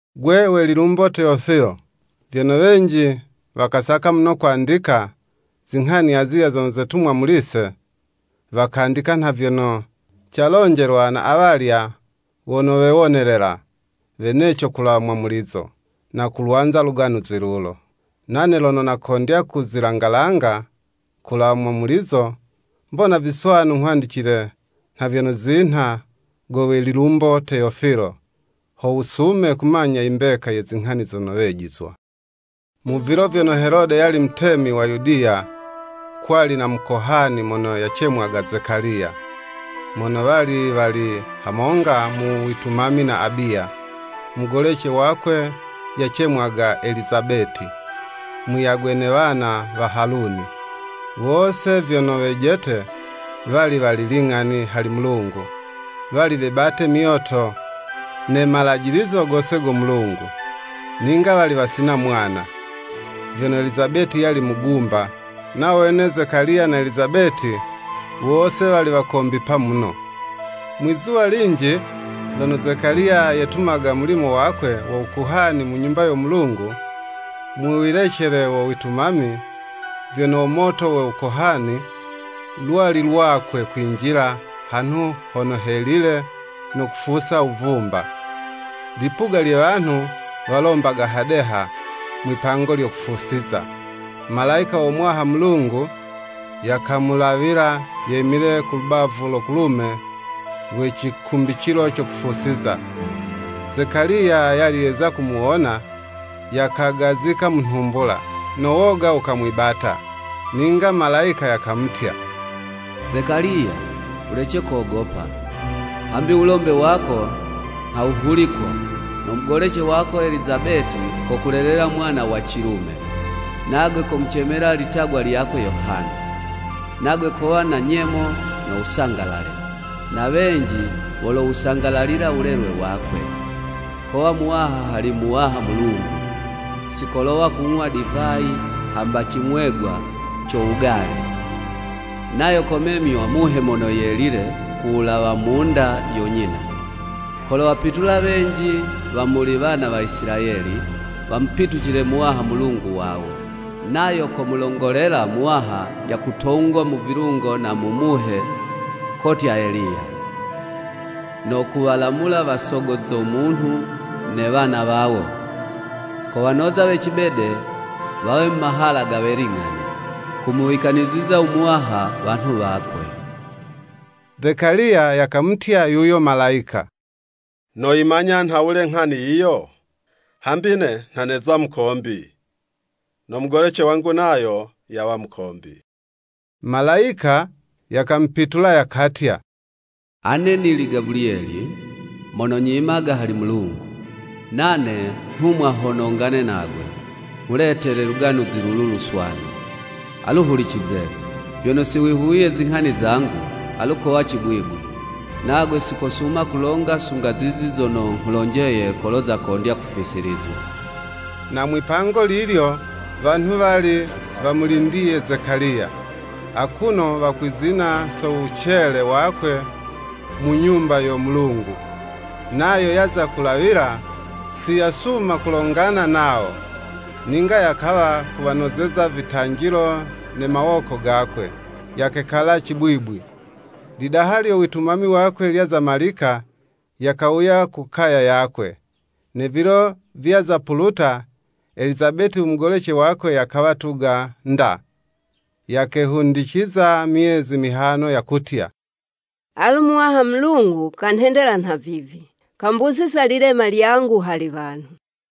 Go we Lilumbo Teyofilo: Vyono wenji wakasaka muno kwandika, zinghani azilya zono zetumwa muli'se! Wakandika nha vyono calonjelwa na awalya wono wewonelela weneco kulawa mwamulizo, no kulwanza Luganuzi lulo. Nane lono nakondya kuzilangalanga kulawa mwamulizo, mbona viswanu nghwandicile nha vyono zinha go we Lilumbo Teyofilo, ho wusume kumanya imbeka ye zinghani zono wejizwa. Mu vilo vyono Helode yali mutemi wa Yudiya, kwali na mukohani mono yacemwaga Zekaliya, mono wali wali hamonga mu witumami na Abiya, Mugolece wakwe yacemwaga Elizabeti, muyagwe ne wana wa Haluni. Wose vyono wejete, wali wali ling'ani hali Mulungu, wali webate myoto ne malajilizo gose go Mulungu. Ninga wali wasina mwana, vyono Elizabeti yali mugumba, nawo wene Zekaliya na Elizabeti, wose wali wakombipa muno. Mwizuwa linji, lono Zekaliya yetumaga mulimo wakwe wo Wukohani mu Nyumba yo Mulungu, mu wilecele wo witumami, vyono wo moto wo Wukohani, lwali lwakwe kwinjila hanhu hono helile no kufusa wuvumba. Lipuga lye wanhu walombaga hadeha mwi'pango lyo kufusiza. Malayika wo Muwaha Mulungu yakamulawila, yemile ku lubavu lo kulume lwe cikumbicilo co kufusiza. Zekaliya yali yeza kumuwona, yakagazika mu nhumbula, no woga wukamwibata. Ninga malayika yakamutya, “Zekaliya, wulece kogopa, hambi wulombe wako nha wuhulikwa, no mugolece wako Elizabeti kokulelela mwana wa cilume, nagwe komucemela litagwa lyakwe Yohana. Nagwe kowa na nyemo no wusangalale, na wenji wolowusangalalila wulelwe wakwe. Kowa muwaha hali Muwaha Mulungu, si kolowa kung'wa divayi hamba cing'wegwa co wugale, nayo komemywa Muhe Mono Yelile ku wulawa mu'nda yo nyina. Kolowapitula wenji wa muli wana wa Isilayeli wamupitucile Muwaha Mulungu wawo. Nayo komulongolela Muwaha yakutongwa mu vilungo na mu Muhe kotya Eliya, no kuwalamula wasogo zo munhu ne wana wawo. Kowanoza we cibede, wawe mu mahala ge we ling'ani, kumuwikaniziza u Muwaha wanhu wakwe.” Zekaliya yakamutya yuyo Malayika, “Noyimanya nhawule nghani yiyo? Hambi ne nha neza mukombi, no mugolece wangu nayo yawa mukombi.” Malayika yakamupitula yakatya, “Ane nili Gabuliyeli, mono nyimaga hali Mulungu, nane nhumwa ho nongane nagwe, nghuletele Luganuzi lulu Luswanu. Alu hulicize, vyono si wihuwiye zinghani zangu, alu kowa cibwibwi, nagwe si kosuma kulonga, sunga zizi zono nghulonjeye kolo zakondya kufisilizwa.” Na mwi'pango lilyo wanhu wali wamulindiye Zekaliya, akuno wakwizina so wucele wakwe mu Nyumba yo Mulungu. Nayo yaza kulawila, si yasuma kulongana nawo, ninga yakawa kuwanozeza vitanjilo ne mawoko gakwe, yakekala cibwibwi. Lidaha lyo witumami wakwe lyaza malika, yakawuya ku kaya yakwe. Ne vilo vyaza puluta, Elizabeti u mugolece wakwe yakawa yatuga 'nda. Yakehundiciza myezi mihano, yakutya, “Alu Muwaha Mulungu kanhendela nhavivi, kambusiza lilema lyangu hali wanhu.”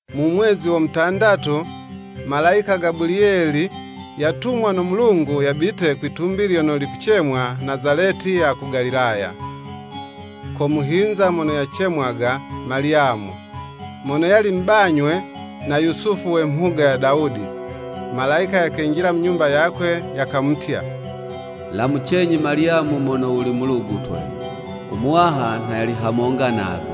Mu mwezi wo mutandatu, malayika Gabuliyeli yatumwa no Mulungu, yabite kwi'tumbi lyono likucemwa Nazaleti ya ku Galilaya. Ko muhinza mono yacemwaga Malyamu, mono yali mubanywe na Yusufu we mhuga ya Dawudi. Malayika yakenjila mu nyumba yakwe, yakamutya, “Lamucenyi Malyamu mono wuli mulugutwe! U Muwaha nha yali hamonga nagwe.”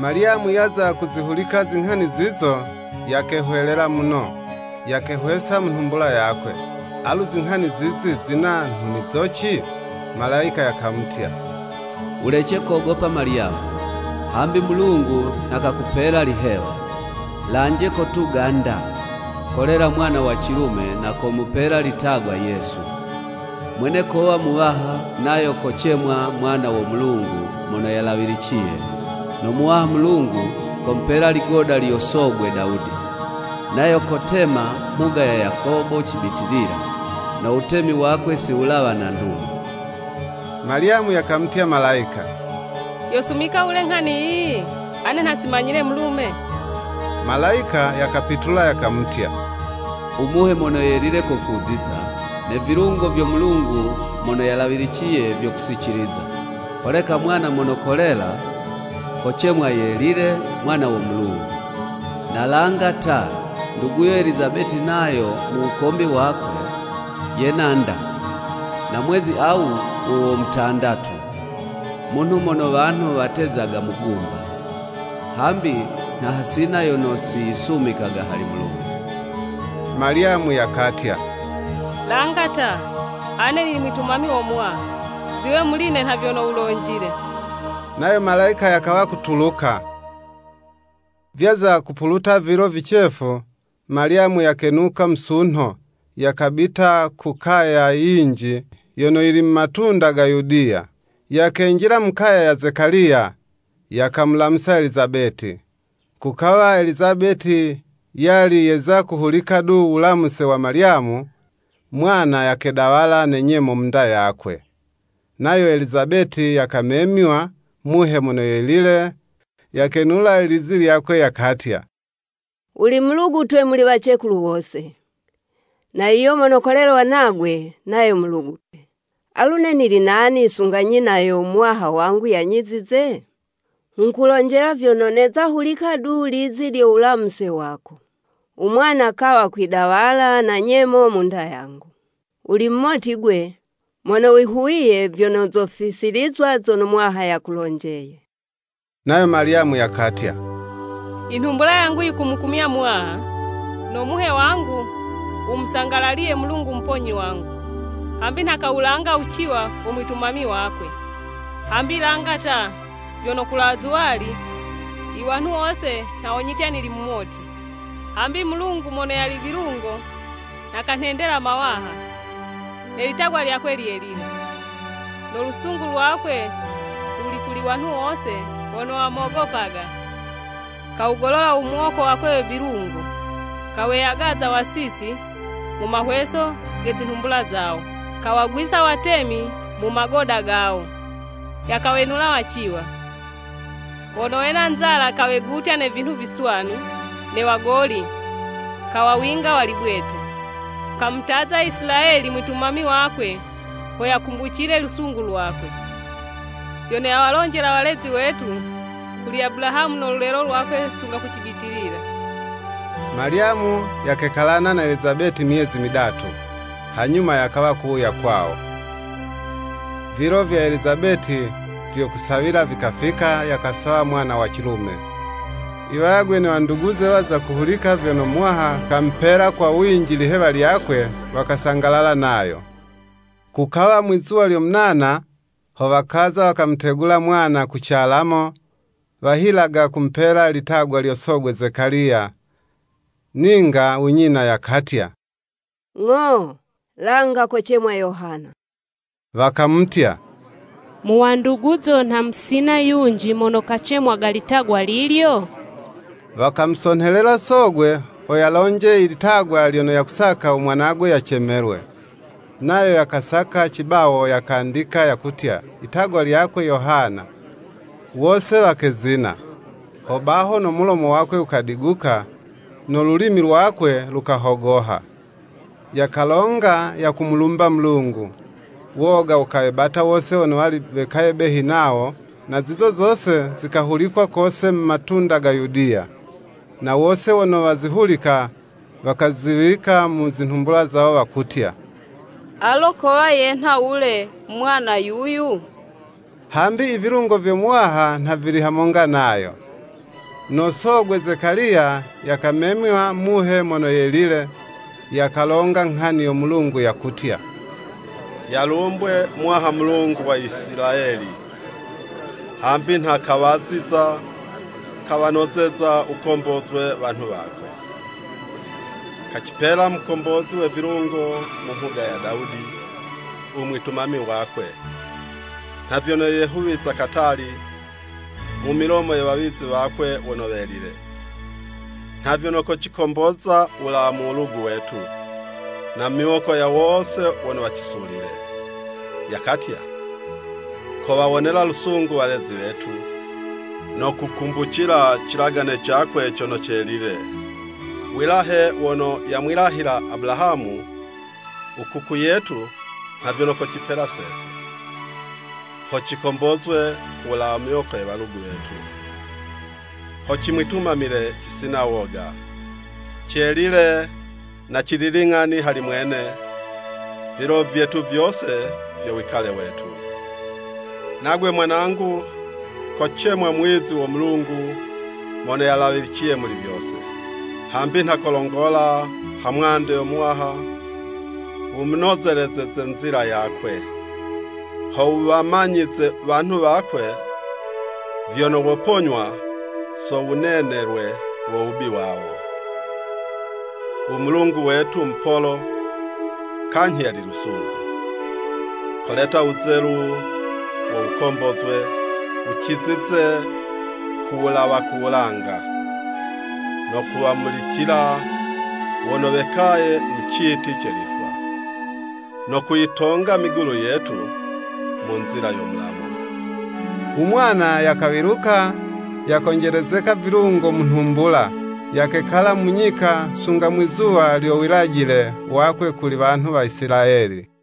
Malyamu yaza kuzihulika zinghani zizo, yakehwelela muno, yakehwesa mu nhumbula yakwe, alu izinghani zizi zina nhunizoci? Malayika yakamutya, “Wulece kogopa Malyamu; hambi Mulungu nha kakupela lihewa. Lanje, kotuga 'nda, kolela mwana wa cilume, na komupela litagwa Yesu. Mwene kowa Muwaha, nayo kocemwa mwana wo Mulungu Mono Yalawiliciye, no Muwaha Mulungu, komupela ligoda lyo sogwe Dawudi; nayo kotema mhuga ya Yakobo cibitilila, no wutemi wakwe si wulawa na ndumo.” Malyamu yakamutya Malayika, “Yosumika wule nghani yiyi, ane nha si manyile mulume?” Malayika yakapitula yakamutya, “U Muhe mono yelile kokuziza, ne vilungo vyo Mulungu Mono Yalawiliciye vyokusiciliza. Holeka mwana mono kolela, kocemwa Yelile, Mwana wo Mulungu. Na langa ta, nduguyo Elizabeti nayo mu wukombi wakwe, yena 'nda na mwezi awu wo wo mutandatu, munhu mono wanhu watezaga mugumba. Hambi nha hasina yono si yisumikaga hali Mulungu.” Malyamu yakatya, “Langa ta, ane nili mwitumami wo Muwaha ziwe muli'ne nha vyono wulonjile.” Nayo Malayika yakawa kutuluka. Vyaza kupuluta vilo vicefu, Malyamu yakenuka musunho, yakabita ku kaya yinji yono yili mu matunda ga Yudiya. Yakenjila mu kaya ya Zekaliya, yakamulamusa Elizabeti. Kukawa Elizabeti yali yeza kuhulika du wulamuse wa Malyamu, mwana yakedawala na nyemo mu'nda yakwe. Nayo Elizabeti yakamemywa Muhe Mono Yelile, yakenula lizi lyakwe, yakatya, “Wuli Mulugutwe muli wacekulu wose, na yuyo mono kolelwa nagwe, nayo Mulugutwe. Alu ne nili nani sunga nyina yo Muwaha wangu yanyizize? Nghukulonjela vyono, neza hulika du lizi lyo wulamuse wako, u mwana kawa kwidawala na nyemo mu'nda yangu. Wuli mumoti 'gwe mono wihuwiye, vyono zofisilizwa zono Muwaha yakulonjeye.” Nayo Malyamu yakatya, “Inhumbula yangu yikumukumya Muwaha, No muhe wangu wumusangalaliye Mulungu Muponyi wangu. Hambi nha kawulanga wuciwa wo mwitumami wakwe! Hambi langa ta, vyono kulawa zuwali, iwanhu wose nha wonyitya nili mumoti. Hambi Mulungu mono yali vilungo nha kanhendela mawaha Ne litagwa lyakwe lyelile. No lusungu lwakwe luli kuli wanhu wose wono wamogopaga. Kawugolola u muwoko wakwe we vilungo Kaweyagaza wasisi mu mahweso ge zinhumbula zawo. Kawagwisa watemi mu magoda gawo Yakawenula waciwa. Wono wena nzala, kawegutya ne vinhu viswanu, Ne wagoli, kawawinga wali bwete. Kamutaza Isilayeli mwitumami wakwe Ho yakumbucile lusungu lwakwe. Vyono yawalonjela walezi wetu, Kuli Abulahamu no lulelo lwakwe sunga ku cibitilila.” Malyamu yakekalana na Elizabeti myezi midatu, hanyuma yakawa kuwuya kwawo. Vilo vya Elizabeti vyo kusawila vikafika, yakasawa mwana wa cilume. I wayagwe ne wanduguze waza kuhulika vyono Muwaha kamupela kwa winji lihewa lyakwe, wakasangalalana nayo. Kukawa mwi'zuwa lyo munana, ho wakaza wakamutegula mwana, ku calamo, wahilaga kumupela litagwa lyo sogwe Zekaliya. Ninga u nyina yakatya, “Ng'o, langa kocemwa Yohana.” Wakamutya, “Mu wanduguzo nha musina yunji mono kacemwaga litagwa lilyo?” Wakamusonhelela sogwe, ho yalonje i litagwa lyono yakusaka u mwanagwe yacemelwe. Nayo yakasaka cibawo, yakandika, yakutya, “Itagwa lyakwe Yohana.” Wose wakezina. Ho baho no mulomo wakwe wukadiguka, no lulimi lwakwe lukahogoha, yakalonga yakumulumba Mulungu. Woga wukawebata wose wono wali wekaye behi nawo, na zizo zose zikahulikwa kose mu matunda ga Yudiya. Na wose wono wazihulika, wakaziwika mu zi nhumbula zawo wakutya, “Alo kowa yenha wule mwana yuyu.” Hambi i vilungo vyo Muwaha nha vili hamonga nayo. No sogwe Zekaliya yakamemywa Muhe Mono Yelile, yakalonga nghani yo Mulungu yakutya, “Yalumbwe Muwaha Mulungu wa Isilayeli. Hambi nha kawaziza, kawanozeza wukombozwe wanhu wakwe. Kacipela Mukombozi we vilungo mu mhuga ya Dawudi u mwitumami wakwe. Nha vyono yehuwiza katali, mu milomo ye wawizi wakwe wono welile, nha vyono kocikomboza wulawa mu walugu wetu, na mu miwoko ya wose wono wacisulile. Yakatya, kowawonela lusungu walezi wetu. No kukumbucila cilagane cakwe cono celile. Wilahe wono yamwilahila Abulahamu u kuku yetu nha vyono kocipela sese, ho cikombozwe ku wulawa mu miwoko ye walugu wetu, ho cimwitumamile cisina woga. Celile na cili ling'ani hali mwene, vilo vyetu vyose vyo wikale wetu. Nagwe, mwanangu, kocemwa muwizi wo Mulungu Mono Yalawiliciye muli vyose, hambi nha kolongola ha mwande yo Muwaha wumunozelezeze nzila yakwe. Ho wuwamanyize wanhu wakwe vyono woponywa so wunenelwe wo wubi wawo. U Mulungu wetu mupolo, kanyhi yali lusungu. Koleta wuzelu wo wukombozwe, wucizize ku wulawa ku wulanga, no kuwamulicila wono wekaye mu citi ce lifwa. No kuyitonga migulu yetu mu nzila yo mulamu.” U mwana yakawiluka, yakonjelezeka vilungo mu nhumbula, yakekala mu nyika, sunga mwizuwa lyo wilajile wakwe kuli wanhu wa Isilayeli.